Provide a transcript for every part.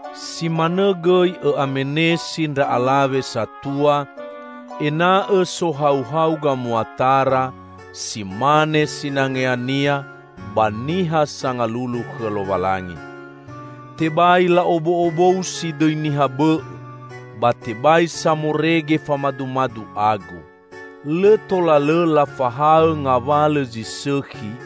Si manõ gõi õ'amenesi ndra alawe satua ena'õ sohauhau gamuatara si mane sinangeania ba niha sangalulu khõ Lowalangi. Tebai la'ob'o'obousi dõi niha bõ'õ, ba tebai samorege famadumadu agu. Lõ tola lõ lafahaõ ngawalõ zi sõkhi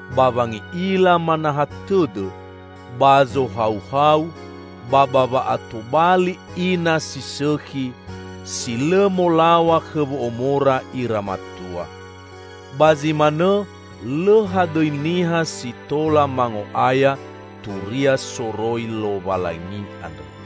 ba wangi'ila manaha tõdõ, ba zohauhau ba ba wa'atobali ina si sõkhi, si lõ molaw̃a khõ wo'omora ira matua. Ba zi manõ lõ hadõi niha si tola mango'aya Turia soroi Lowalangi andrõ.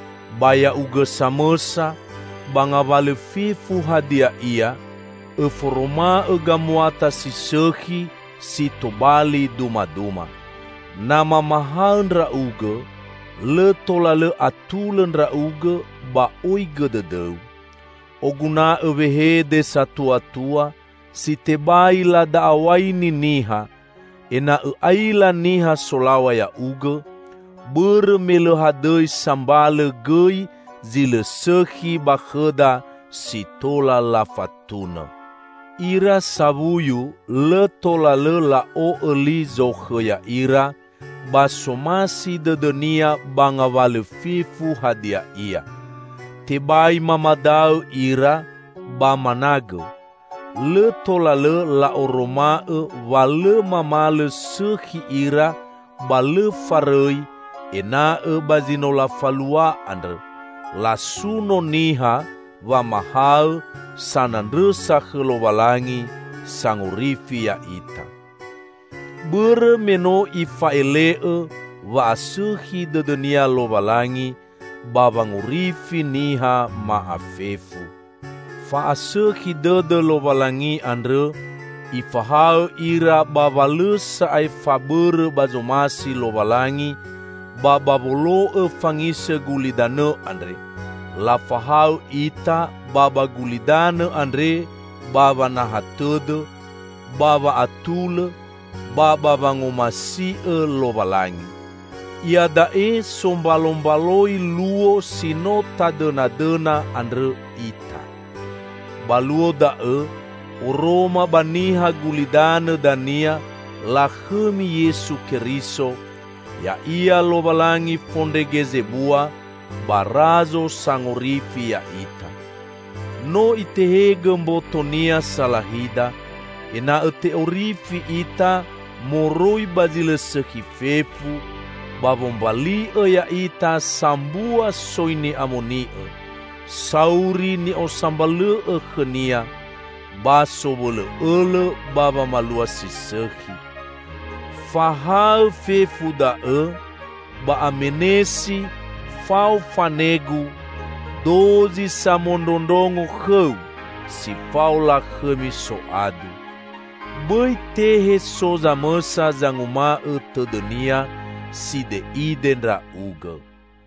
Ba ya'ugõ samõsa, ba ngawalõ fefu hadia ia, õforoma'õ gamuata si sõkhi si tobali dumaduma. Na mamahaõ ndra'ugõ, lõ tola lõ atulõ ndra'ugõ ba oigõ dõdõu. Oguna'õ wehede satuatua, si tebai lada'aw̃aini niha, ena'õ aila niha solaw̃a ya'ugõ, bõrõ me lõ hadõi sambalõ gõi zi lõ sõkhi ba khõda si tola lafatunõ. Ira sawuyu lõ tola lõ la'o'õ li zokhõ ya'ira, ba somasi dõdõnia ba ngawalõ fefu hadia ia. Tebai mamadaõ ira, ba managõ. Lõ tola lõ la'oroma'õ wa lõ mamalõ sõkhi ira ba lõ farõi; ena'õ ba zi no lafalua andrõ, lasuno niha wamahaõ sanandrõsa khõ Lowalangi, Sangorifi ya'ita. Bõrõ me no Ifa'ele'õ wa'asõkhi dõdõ-Nia Lowalangi ba wangorifi niha ma'afefu. Fa'asõkhi dõdõ Lowalangi andrõ Ifahaõ ira ba wa lõ sa'ae fabõrõ ba zomasi Lowalangi ba ba wolo'õ fangisõ gulidanõ andre; lafahaõ ita ba ba gulidanõ andre ba wanaha tõdõ, ba wa'atulõ, ba ba wangomasi'õ Lowalangi. Iada'e sombalombaloi luo si no tadõnadõna andrõ ita. Ba luo da'õ oroma ba niha gulidanõ dania lakhõmi Yesu Keriso, ya'ia Lowalangi Fondrege Zebua ba Razo Sangorifi ya'ita. No Itehegõ mboto-Nia salahida, ena'õ te'orifi ita moroi ba zi lõ sõkhi fefu, ba wombali'õ ya'ita sambua soi ni'amoni'õ, sauri ni'osambalõ'õ khõ-Nia, ba sowõlõ'õlõ ba wamalua si sõkhi. Fahaõ fefu da'õ, ba amenesi fao fanegu dozi samondrondrongo khõu si fao lakhõmi soadu. Bõi tehe so zamõsa zanguma'õ tõdõnia side'ide ndra'ugõ.